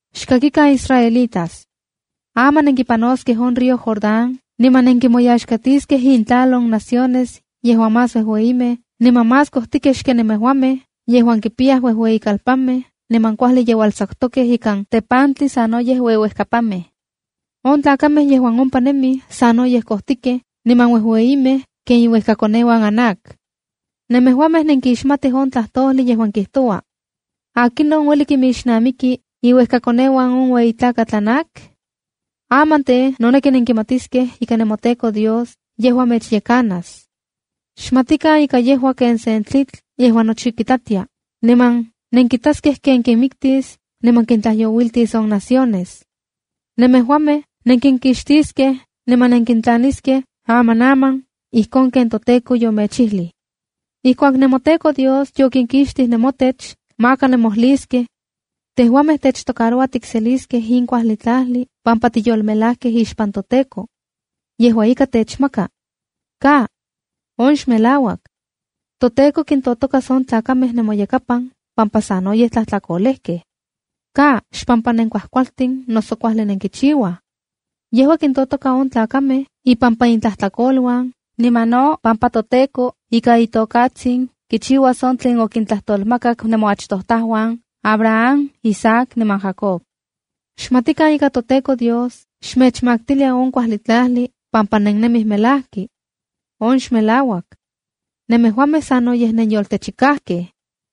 ’Xkakikan israelitas. Aman nenkipanoskej on río Jordán niman nenkimoyaxtiskej intlal on naciones yejuan más uejueyimej niman más kojtikej xken nemejuamej, yejuan kipiyaj uejueyikalpanmej niman kuajli yeualtsakutokej ikan tepantli sanoyej ueuejkapanmej. On tlakamej yejuan ompa nemij sanoyej kojtikej niman uejueyimej ken iuejkakoneuan Anac. Nemejuamej nenkixmatij on tlajtojli yejuan kijtoua: “¿Akinon ueli kinmixnamiki iuejkakoneuan on ueyi tlakatl Anac?” ’Aman tej, noneki nenkimatiskej ika nemoTEKO Dios yejua mechyekanas. Xmatikan ika yejua ken sen tlitl yejuan nochi kitlatia, niman nenkitaskej ken kinmiktis niman kintlajyouiltis on naciones. Nemejuamej nenkinkixtiskej niman nenkintlaniskej amanaman, ijkon ken toTEKO yomechijlij. ’Ijkuak nemoTEKO Dios yokinkixtij nemotech, maka nemojliskej: “Tejuamej techtoaroua tikseliskej in kuajli tlajli pampa tiyolmelajkej ixpan toTEKO. Yejua ika, techmaka.” ¡Ka! On xmelauak. ToTEKO kintotokas on tlakamej nemoyekapan pampa sanoyej tlajtlakolejkej. Ka, xpampa nenkuajkualtin noso kuajli nenkichiuaj. Yejua kintotoka on tlakamej ipampa intlajtlakoluan niman no pampa toTEKO ika itokatsin kichiuas on tlen okintlajtolmakak nemoachtojtajuan Abraham, Isaac niman Jacob. Xmatikan ika toTEKO Dios xmechmaktilia on kuajli tlajli pampa nennemij melajki. On xmelauak. Nemejuamej sanoyej nenyoltechikajkej.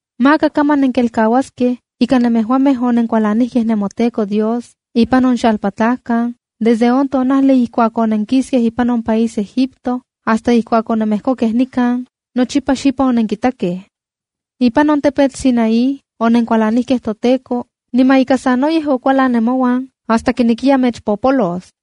’Maka kaman nenkelkauaskej ika nemejuamej onenkualanijkej nemoTEKO Dios ipan on xalpatlajkan, desde on tonajli ijkuak onenkiskej ipan on país Egipto hasta ijkuak onemejkokej nikan, nochipa xipan onenkitakej. ’Ipan on tepetl Sinaí onenkualanijkej toTEKO, niman ika sanoyej okualan ne mouan hasta kinekiya mechpopolos.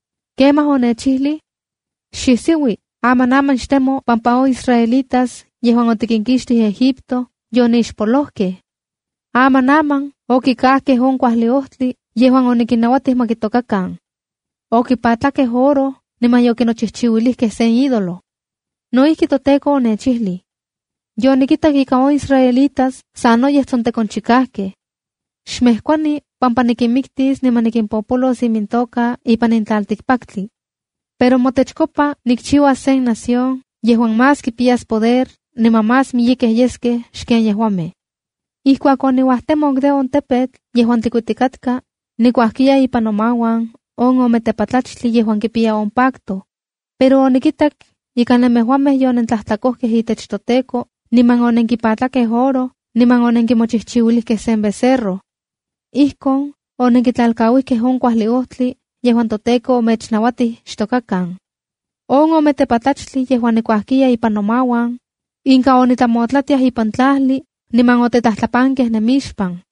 Kemaj onechijlij: “Xisiui, amanaman xtemo pampa on israelitas yejuan otikinkixtij Egipto yonixpolojkej. Amanaman okikajkej on kuajli ojtli yejuan onikinnauatij ma kitokakan. Okipatlakej oro niman yokinochijchiuilijkej sen ídolo.” ’No ijki, toTEKO onechijlij: “Yonikitak ika on israelitas sanoyej tsontekonchikajkej. ‘Xmejkuani pampa nikinmiktis niman nikimpopolos imintoka ipan in tlaltikpaktli. Pero motechkopa nikchiuas sen nación yejuan más kipiyas poder, niman más miyekej yeskej xken yejuamej.” ’Ijkuak oniuajtemok de on tepetl yejuan tlikuitikatka, nikuajkiya ipan nomauan, on ome tepatlachtli yejuan kipiya on pacto. Pero onikitak ika nemejuamej yonentlajtlakojkej itech toTEKO, niman onenkipatlakej oro, niman onenkimochijchiuilijkej sen becerro. Ijkon onenkitlalkauijkej on kuajli ojtli yejuan toTEKO omechnauatij xtokakan. On ome tepatlachtli yejuan nikuajkiya ipan nomauan, inka onitlamotlatiaj ipan tlajli, niman otetlajtlapankej nemixpan.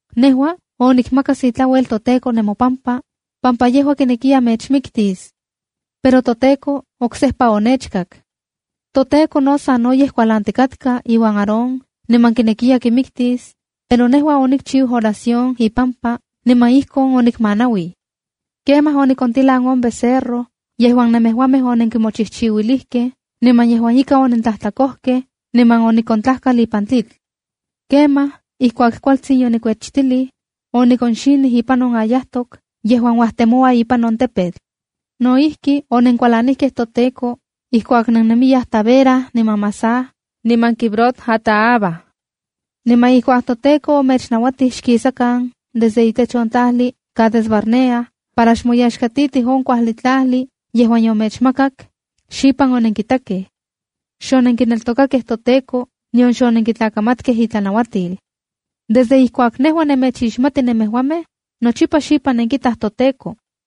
Nejua onikmakas itlauel toTEKO nemopampa, pampa yejua kinekiya mechmiktis. Pero toTEKO oksejpa onechkak. ToTEKO no sanoyej kualantikatka iuan Aarón niman kinekiya kimiktis, pero nejua onikchiu oración ipampa, niman ikon onikmanauij. Kemaj onikontilan on becerro yejuan nemejuamej onenkimochijchiuilijkej niman yejuan ika onentlajtlakojkej, niman onikontlajkal ipan tlitl. Kemaj, ijkuak kualtsin yonikuechtilij, onikonxinij ipan on ayajtok yejuan uajtemoua ipan on tepetl. ’No ijki, onenkualanijkej toTEKO ijkuak nennemiyaj Tabera, niman Masah niman Kibrot-hataava. Niman ijkuak toTEKO omechnauatij xkisakan desde itech on tlajli Cades-barnea para xmoyaxkatitij on kuajli tlajli yejuan yomechmakak, xipan onenkitakej. Xonenkineltokakej toTEKO, nion xonenkitlakamatkej itlanauatil. Desde ijkuak nejua nemechixmati nemejuamej, nochipa xipan nenkitaj toTEKO.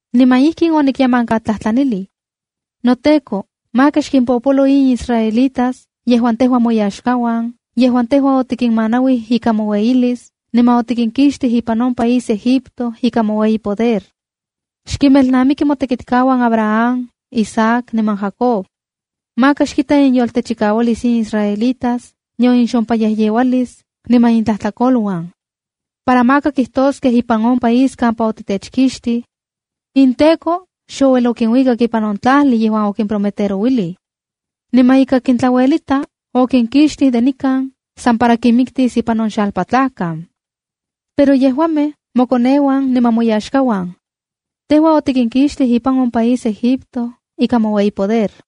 ’Niman ijkin onikyemankatlajtlanilij: “NoTEKO, maka xkimpopolo in israelitas yejuan tejua moyaxkauan, yejuan tejua otikinmanauij ika moueyilis, niman otikinkixtij ipan on país Egipto ika moueyi poder. Xkimelnamiki motekitkauan Abraham, Isaac niman Jacob. Maka xkita inyoltechikaualis in israelitas, nion inxompayejyeualis niman intlajtlakoluan. Para maka kijtoskej ipan on país kampa otitechkixtij: “InTEKO xouel okinuikak ipan on tlajli yejuan okimprometerouilij. Niman ika kintlauelita, okinkixtij de nikan san para kinmiktis ipan on xalpatlajkan. Pero yejuamej mokoneuan niman moyaxkauan. Tejua otikinkixtij ipan on país Egipto ika moueyi poder.”